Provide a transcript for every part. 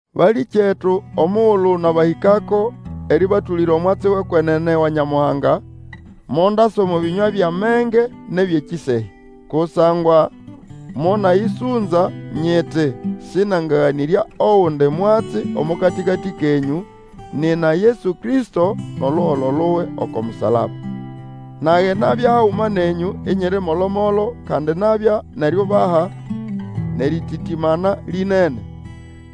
Balĩkyetu, omugulu nabahĩkako erĩbatũlĩra omwatsi wʼekwenene wa Nyamuhanga, mondasa omo bĩnywa byʼamenge nʼebyʼekĩsehya. Kusangwa monayĩsũnza nyiti sĩnangaganĩrya ogundi mwatsi omo katĩkatĩ kenyũ, nina Yesu Kristo, nʼoluholo luwe oko musalaba. Nage nabya haguma nenyũ, inyiri molo-molo, kandi nabya nʼeriubaha, nʼerititimana lĩnene.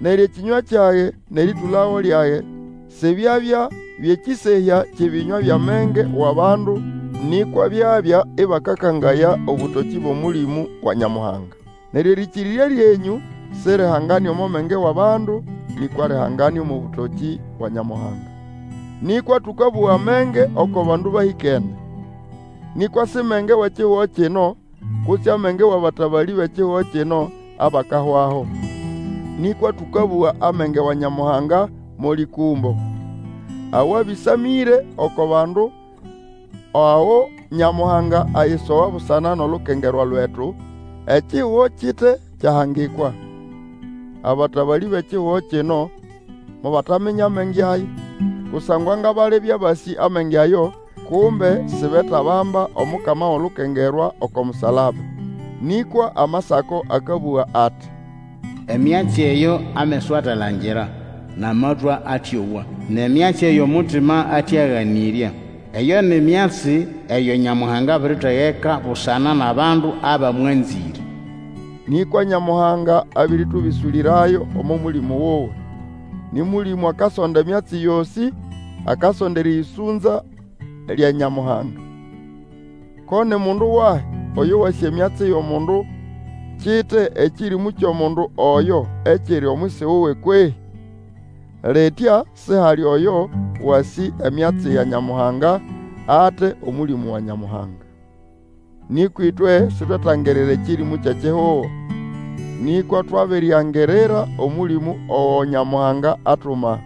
Neryo ekĩnywa kyage nʼerĩtũlago lyage, sibyabya byʼekĩsehya kyʼebĩnywa byʼamenge wʼabandu, nĩkwa byabya ĩbakakangaya obũtokĩ bwʼOmũlĩmũ wa Nyamuhanga. Neryo erĩkĩrĩrya lyenyũ sirihangane omo menge wʼabandu, nĩkwa lihangane omo bũtokĩ bwa Nyamuhanga. Nĩkwa tũkabũga amenge oko bandu bahĩkene. Nĩkwa si menge wʼekihugo kino, kutse amenge wʼabatabalĩ bʼekihugo kino, abakahwaho. Nĩkwa tũkabũga amenge wa Nyamuhanga mo lĩkũmbo, awabĩsamĩre oko bandu ago Nyamuhanga ayisoga busana nʼolukengerwa lwetu, ekihugo kite kyahangikwa. Abatabalĩ bʼekihugo kino mobataminya amenge aya. Kusangwa nga balibya basĩ amenge ayo, kumbe sibetabamba Omukama wʼolukengerwa oko musalaba. Nĩkwa Amasako akabũga ati, Emyatsi eyo ameso ate alangira, nʼamatwĩ atĩowa, Nʼemyatsi eyo mutima ate aganĩrya, Eyo ni myatsi eyo Nyamuhanga abiritegeka busana nʼabandu abamwanzĩre. Nĩkwa Nyamuhanga abĩrĩtũbĩsũlĩrayo omo Mũlĩmũ wuwe. Nĩ Mũlĩmũ akasonda emyatsi yosĩ, akasonda erĩyĩsũnza lya Nyamuhanga. Ko ni mundu wahi oyo wasĩ emyatsi yʼomundu kite ekĩrĩmũ kyʼomundu oyo ekiri omwisi wuwe kwehĩ? Litya sihali oyo wasĩ emyatsi ya Nyamuhanga ate Omũlĩmũ wa Nyamuhanga. Nĩkwa ĩtwe sitwetangirira ekĩrĩmũ kyʼekihugo, nĩkwa twabiriangirira Omũlĩmũ ogo Nyamuhanga atuma,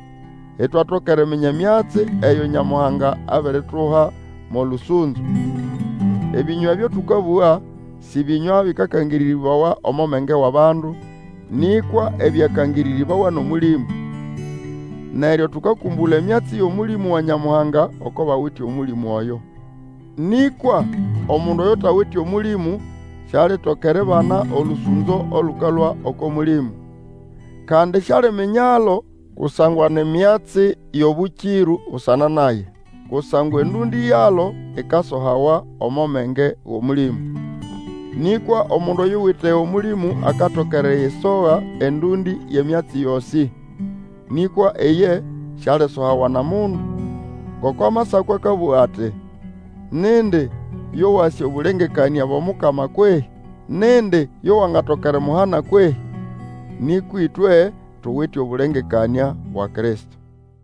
itwatoka eriminya emyatsi eyo Nyamuhanga abirituha mo lũsũnzo. Ebĩnywa ebyo tũkabũga, sĩ bĩnywa byakangĩrĩrĩbawa omo menge wʼabandu, nĩkwa ebyakangĩrĩrĩbawa nʼOmũlĩmũ, neryo tũkakũmbũla emyatsi yʼOmũlĩmũ wa Nyamuhanga oko bawite Omũlĩmũ oyo. Nĩkwa omundu oyutawite Omũlĩmũ sialitoka eribana olũsũnzo olũkalũa oko Mũlĩmũ. Kandi sialiminyalo kusangwa ni myatsi yʼobũkĩrũ busana naye. Kusangwa endũndĩ yalo ikasohawa omo menge wʼOmũlĩmũ. Nĩkwa omundu oyuwite Omũlĩmũ akatoka erisoha endũndĩ yʼemyatsi yosĩ, nĩkwa iye sialisohawa nʼomundu. Ngoko Amasako akabũga ati, Nindi yo wasĩ obũlengekanĩa bwʼomukama kwehĩ? Nindi yo wangatoka erimuhana kwehĩ? Nĩkwa ĩtwe tuwite obũlengekanĩa bwa Kristo.